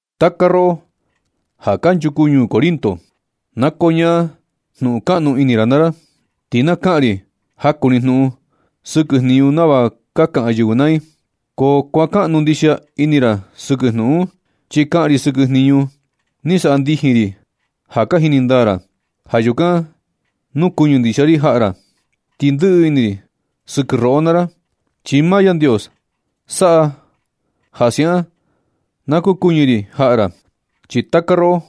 Taka roꞌo ja kanchuku ñuu Corinto, na koñaa jnuꞌun kaꞌnu ini ra naa ra, ti na kaꞌan ri jaku ni jnuꞌun sɨkɨ jniñu nava ka kaꞌan yɨvɨ naa i. Ko kuakaꞌnu ndixia ini ra sɨkɨ jnuꞌun un, chi kaꞌan ri sɨkɨ jniñu ni saꞌa ndijin ri ja ka jini ndaa ra. Ja yukan kukuɨñɨ ndixia ri jaꞌa ra, ti ndɨꞌɨ ini ri sɨkɨ roꞌo naa ra. Chi maa Yandios saꞌa ja siaꞌan na kukuɨñɨ ri jaꞌa ra. Chi taka roꞌo,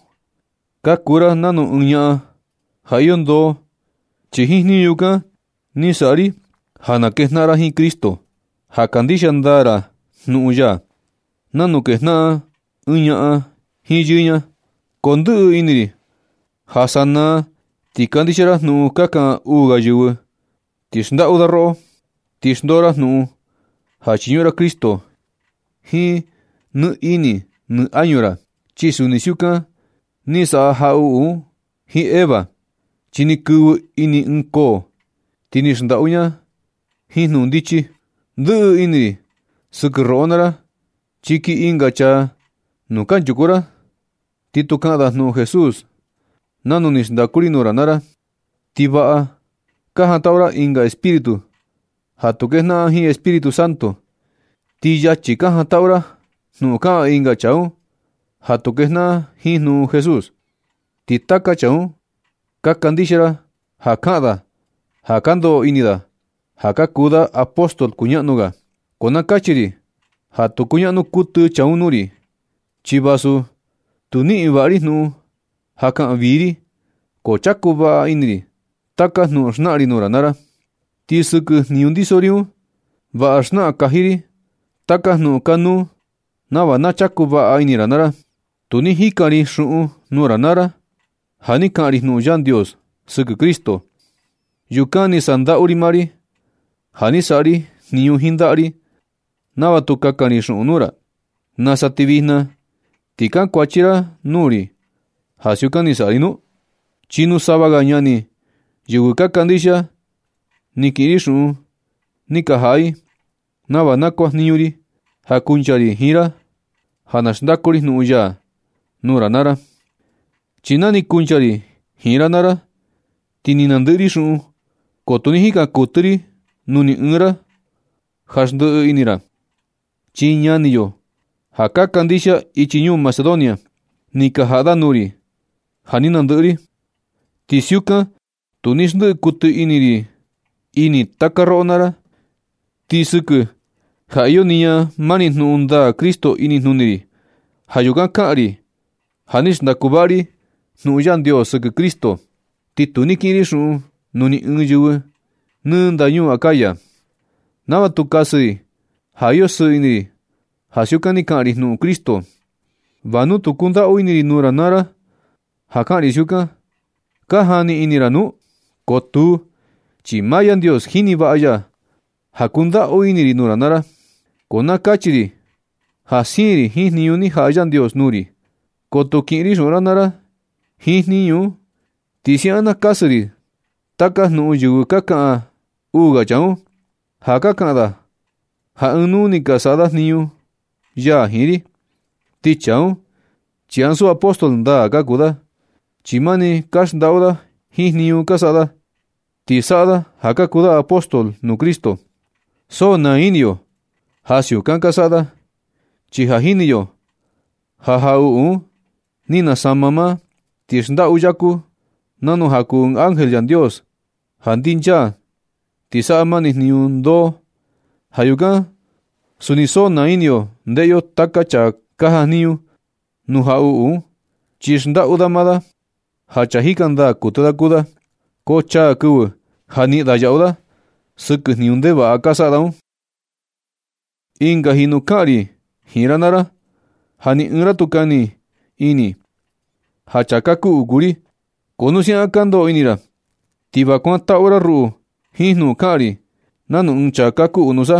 ka kuu ra nanu ɨɨn ñaꞌan ja iyo ndoo, chi jiin jniñu yukan ni saꞌa ri ja na kejnaꞌan ra jiin Cristo, ja kandixia ndaa ra jnuꞌun ya, nanu kejnaꞌan ɨɨn ñaꞌan jiin yɨɨ ña. Ko ndɨꞌɨ ini ri ja sanaa ti kandixia ra jnuꞌun ka kaꞌan uu ga yɨvɨ ti xndaꞌu da roꞌo, ti xndoo ra jnuꞌun ja chiñuꞌun ra Cristo jiin nɨ ini nɨ añu ra. Chi suni siukan ni saꞌa jaꞌuꞌu jiin Eva, chi ni kɨvɨ ini ɨɨn koo, ti ni xndaꞌu i ña jiin jnuꞌun ndichi. Ndɨꞌɨ ini ri sɨkɨ roꞌo naa ra, chi kii ɨnga chaa nuu kanchuku ra ti tu kaꞌan da jnuꞌun Jesús nanu ni xndaku ri nuu ra naa ra, ti vaꞌa ka jantaꞌu ra ɨnga espíritu ja tu kejnaꞌan jiin Espíritu Santo. Ti yachi ka jantaꞌu ra jnuꞌun kaꞌan ɨnga chaa un ja tu kejnaꞌan jiin jnuꞌun Jesús. Ti taka chaa un ka kandixia ra ja kaꞌan da ja ka ndoꞌo ini da ja ka kuu da apóstol kuñaꞌnu ga, ko na kachi ri ja tu kuñaꞌnu kuɨtɨ chaa un nuu ri. Chi vasu tu niꞌin vaꞌa ri jnuꞌun ja kaꞌan vii ri, ko chaku vaꞌa ini ri taka jnuꞌun xnaꞌan ri nuu ra naa ra. Ti sɨkɨ jniñu ndiso ri un, vaꞌa xnaꞌan kaji ri taka jnuꞌun kanuu, nava na chaku vaꞌa ini ra naa ra. Tu ni jikan ri xuꞌun nuu ra naa ra, ja ni kaꞌan ri jnuꞌun Yandios sɨkɨ Cristo. Yukan ni sandaꞌu ri maa ri ja ni saꞌa ri jniñu jiin ndaꞌa ri nava tu kakan ri xuꞌun nuu ra. ¿Nusa ti vijna ti kankuachi ra nuu ri ja siukan ni saꞌa ri nu? Chi nuu sava ga ñani yɨvɨ ka kandixia ni kiꞌin ri xuꞌun ni ka jaꞌa i, nava na kuajniñu ri ja kuncha ri jiin ra ja na xndaku ri jnuꞌun ya nuu ra naa ra. Chi na ni kuncha ri jiin ra naa ra ti ni nandɨꞌɨ ri xuꞌun, ko tu ni jikan kuɨtɨ ri nuu ni ɨɨn ra ja xndiꞌi ri ini ra. Chi ñani yo ja ka kandixia ichi ñuu Macedonia, ni ka jaꞌa da nuu ri ja ni nandɨꞌɨ ri. Ti siukan tu ni xndiꞌi kuɨtɨ ri ini taka roꞌo naa ra. Ti sɨkɨ ja iyo niña mani jnuꞌun ndaa Cristo inijnuni ri, ja yukan kaꞌan ri ja ni xndaku vaꞌa ri jnuꞌun Yandios sɨkɨ Cristo. Ti tu ni kiꞌin ri xuꞌun nuu ni ɨɨn yɨvɨ nɨ ndañuu Acaya, nava tu kasɨ i ja iyo sɨɨ ini ri ja siukan ni kaꞌan ri jnuꞌun Cristo. ¿Va nu tu kundaꞌu ini ri nuu ra naa ra ja kaꞌan ri siukan, ka jani ini ra nu? Ko tuu, chi maa Yandios jini vaꞌa ya ja kundaꞌu ini ri nuu ra naa ra. Ko na kachi ri ja siin ri jiin jniñu ni jaꞌa Yandios nuu ri, ko tu kiꞌin ri xuꞌun ra naa ra jiin jniñu un. Ti siaꞌan na kasɨ ri taka jnuꞌun vixi ka kaꞌan uu ga chaa un, ja ka kaꞌan da ja ɨɨn nuu ni ka saꞌa da jniñu ya jiin ri. Ti chaa un, chi ansu apóstol ndaa ka kuu da, chi mani ka xndaꞌu da jiin jniñu ka saꞌa da. Ti saꞌa da ja ka kuu da apóstol nuu Cristo. So naa ini yo ja siukan ka saꞌa da, chi ja ni jini yo ja jaꞌuꞌu un ni nasama maa, ti xndaꞌu yaku, nanu ja kuu ɨɨn ángel Yandios ja ndinchaa ti saꞌa mani jniñu ndoo. Ja yukan suni so naa ini yo ndeꞌe yo taka chaa ka jajniñu nuu jaꞌuꞌu un, chi xndaꞌu da maa da ja chaa jika ndaa kuɨtɨ kuu da. Ko chaa kɨvɨ ja niꞌin da yaꞌu da sɨkɨ jniñu ndevaꞌa ka saꞌa da un. Ɨnga jinu kaꞌan ri jiin ra naa ra ja ni ɨɨn ra tu kani ini ja chaa kakuꞌu kuu ri. Ko nu siaꞌan ka ndoꞌo ini ra, ti va kuantaꞌu ra ruꞌu jiin jnuꞌun kaꞌan ri nanu ɨɨn chaa kakuꞌu nusa.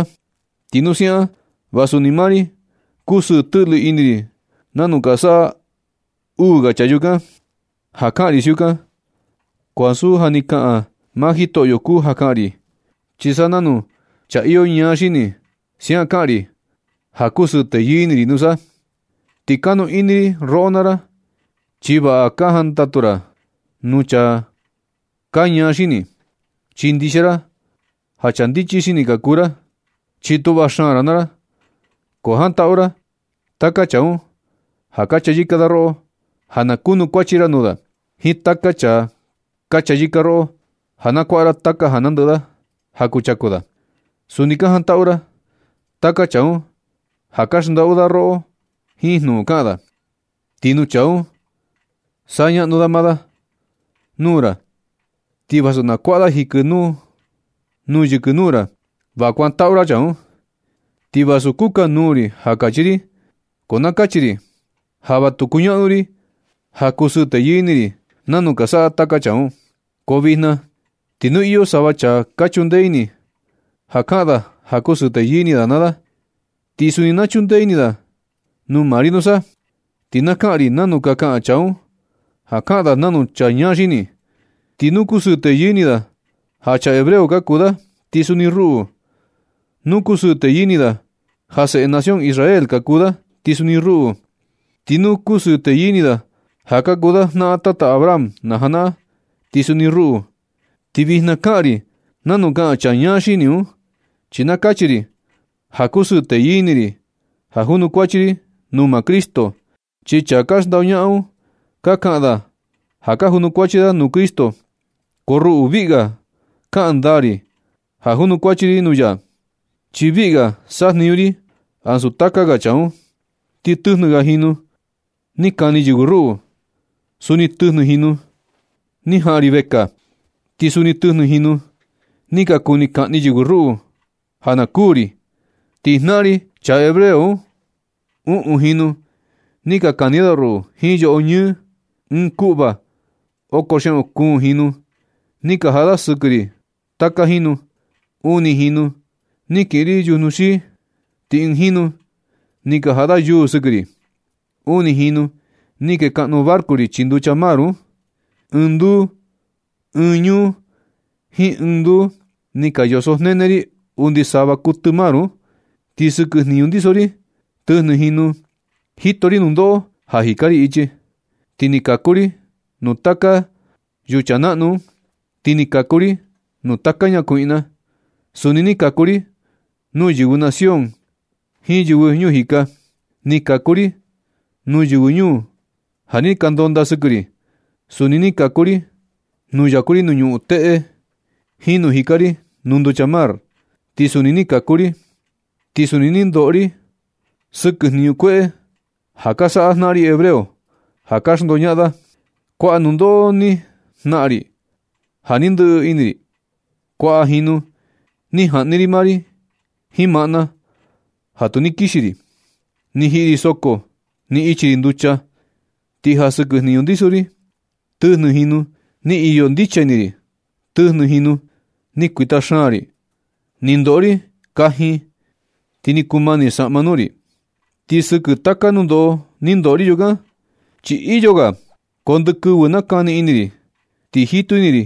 Ti nu siaꞌan, va suni maa ri kusɨɨ tɨꞌlɨ ini ri nanu ka saꞌa uu ga chaa yukan. Ja kaꞌan ri siukan, ko ansu ja ni kaꞌan maa Jitoꞌyo kuu ja kaꞌan ri, chi sa nanu chaa iyo ñaa xini, siaꞌan kaꞌan ri ja kusɨɨ teyɨɨ ini ri nusa. Ti kanu ini ri roꞌo naa ra, chi vaꞌa ka jantaꞌu ra nuu chaa ka ñaa xini, chi ndixia ra ja chaa ndichi xini ka kuu ra, chi tuꞌva xaan ra naa ra. Ko jantaꞌu ra taka chaa un ja ka chayɨka da roꞌo ja na kunukuachi ra nuu da, jiin taka chaa ka chayɨka roꞌo ja na kuaꞌa ra taka ja nandɨꞌɨ da ja kuchaku da. Suni ka jantaꞌu ra taka chaa un ja ka xndaꞌu da roꞌo jiin jnuꞌun kaꞌan da. Ti nu chaa un saꞌa ñaꞌnu da maa da nuu ra ti vasu na kuaꞌa da jikɨ nuu yɨkɨ nuu ra, va kuantaꞌu ra chaa un. Ti vasu kukanuu ri ja kachi ri, ko na kachi ri ja va tu kuñaꞌnu ri ja kusɨɨ teyɨɨ ini ri nanu ka saꞌa taka chaa un. Ko vijna ti nu iyo sava chaa ka chundee ini da kaꞌan da ja kusɨɨ teyɨɨ ini da naa da, ti suni na chundee ini tu maa ri nusa. Ti na kaꞌan ri nanu ka kaꞌan chaa un ja kaꞌan da nanu chaa ñaa xini. Ti nu kusɨɨ teyɨɨ ini da ja chaa hebreo ka kuu da, ti suni ruꞌu. Nu kusɨɨ teyɨɨ ini da ja seꞌe nación Israel ka kuu da, ti suni ruꞌu. Ti nu kusɨɨ teyɨɨ ini da ja kuu da jnaꞌan tata Abraham na janaꞌan, ti suni ruꞌu. Ti vijna kaꞌan ri nanu kaꞌan chaa ñaa xini un, chi na kachi ri ja kusɨɨ teyɨɨ ini ri ja junukuachi ri nuu maa Cristo. Ti chaa ka xndoñaꞌan un ka kaꞌan da ja ka junukuachi da nuu Cristo, ko ruꞌu viꞌi ga kaꞌan ndaa ri ja junukuachi ri nuu ya, chi viꞌi ga sajniñu ri ansu taka ga chaa un. Ti tɨjnɨ ga jinu ni kani yɨvɨ ruꞌu. Suni tɨjnɨ jinu ni jaꞌan ri vekaa. Ti suni tɨjnɨ jinu ni ka kuni kaꞌni yɨvɨ ruꞌu ja na kuū ri. Ti jnaꞌan ri chaa hebreo un, uꞌun jinu ni ka kani da ruꞌu jiin yoꞌo ñɨɨ, ɨɨn kuꞌva oko xiaꞌun kuun jinu ni ka jaꞌa da sɨkɨ ri taka jinu. Uni jinu ni kiꞌin ri yujnu xii. Ti ɨɨn jinu ni ka jaꞌa da yuu sɨkɨ ri. Uni jinu ni kee kaꞌnu barco ri chii nducha mar un. Ɨɨn ñuu jiin ɨɨn nduu ni ka yosojnene ri undi sava kuɨtɨ mar un. Ti sɨkɨ jniñu ndiso ri, tɨjnɨ jinu jito ri nundoꞌo ja jika ri ichi. Ti ni kaku ri nuu taka yucha naꞌnu un. Ti ni kaku ri nuu taka ñakuiꞌna. Suni ni kaku ri nuu yɨvɨ nación ri jiin yɨvɨ ñuu jika. Ni kaku ri nuu yɨvɨ ñuu ja ni ka ndondaa sɨkɨ ri. Suni ni kaku ri nuu yaku ri nuu ñuꞌun teꞌe, jiin nuu jika ri nuu nducha mar ti suni ni kaku ri. Ti suni ni ndoꞌo ri sɨkɨ jniñu kueꞌe ja ka saꞌa jnaꞌan ri hebreo ja ka xndoñaꞌan da. Kuaꞌa nundoꞌo ni jnaꞌan ri ja ni ndɨꞌɨ ini ri. Kuaꞌa jinu ni jaꞌni ri maa ri jiin maꞌna ja tu ni kixi ri. Ni jiꞌi ri soko. Ni ichi ri nducha. Ti ja sɨkɨ jniñu ndiso ri tɨjnɨ jinu ni iyo ndicha ini ri. Tɨjnɨ jinu ni kuita xaan ri. Ni ndoꞌo ri kajin ti ni kumani saꞌma nuu ri. Ti sɨkɨ taka nundoꞌo ni ndoꞌo ri yukan, chi iyo ga. Ko ndɨ kɨvɨ nakani ini ri, ti jitu ini ri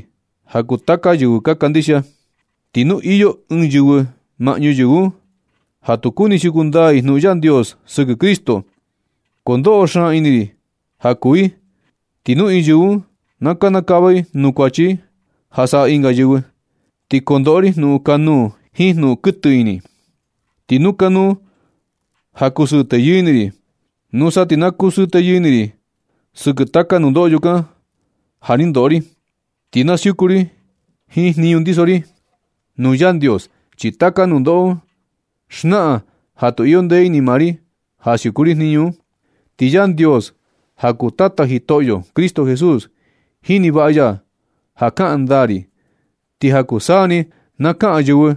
ja kuu taka yɨvɨ kandixia. Ti nu iyo ɨɨn yɨvɨ maꞌñu yɨvɨ un ja tu kuni siuku ndaa i jnuꞌun Yandios sɨkɨ Cristo, ko ndoꞌo xaan ini ri ja kuu i. Ti nu ɨɨn yɨvɨ un na kanakava i nuu kuachi ja saꞌa ɨnga yɨvɨ, ti kondoꞌo ri jnuꞌun kanuu jiin jnuꞌun kuɨtɨ ini. Ti nu kanuu ja kusɨɨ teyɨɨ ini ri, nusa ti na kusɨɨ teyɨɨ ini ri sɨkɨ taka nundoꞌo yukan ja ni ndoꞌo ri, ti na siuku ri jiin jniñu ndiso ri nuu Yandios, chi taka nundoꞌo un xnaꞌan ja tu iyo ndee ini maa ri ja siuku ri jniñu un. Ti Yandios, ja kuu Tata Jitoꞌyo Cristo Jesús, jini vaꞌa ya ja kaꞌan ndaa ri. Ti ja kuu taka saa ni na kaꞌan yɨvɨ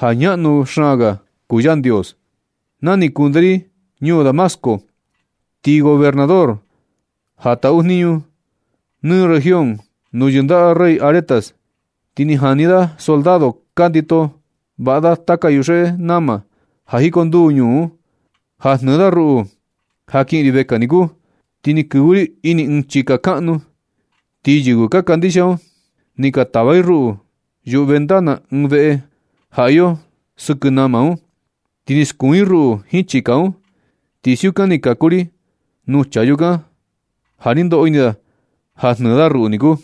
ja ñaꞌnu xaan ga kuu Yandios. Na ni kunde ri ñuu Damasco, ti gobernador ja taꞌu jniñu nɨ región nuu yɨndaꞌa rey Aretas, ti ni jani da soldado ka ndito vaꞌa taka yuxeꞌe nama ja jikonduu ñuu un, ja jnɨɨ da ruꞌu ja kiꞌin ri vekaa niku. Ti ni kɨvɨ ri ini ɨɨn chika kaꞌnu, ti yɨvɨ ka kandixia un, ni ka tava i ruꞌu yuꞌu ventana ɨɨn veꞌe ja iyo sɨkɨ nama un, ti ni skuun i ruꞌu jiin chika un. Ti siukan ni kaku ri nuu chaa yukan, ja ni ndoꞌo ini da ja jnɨɨ da ruꞌu niku.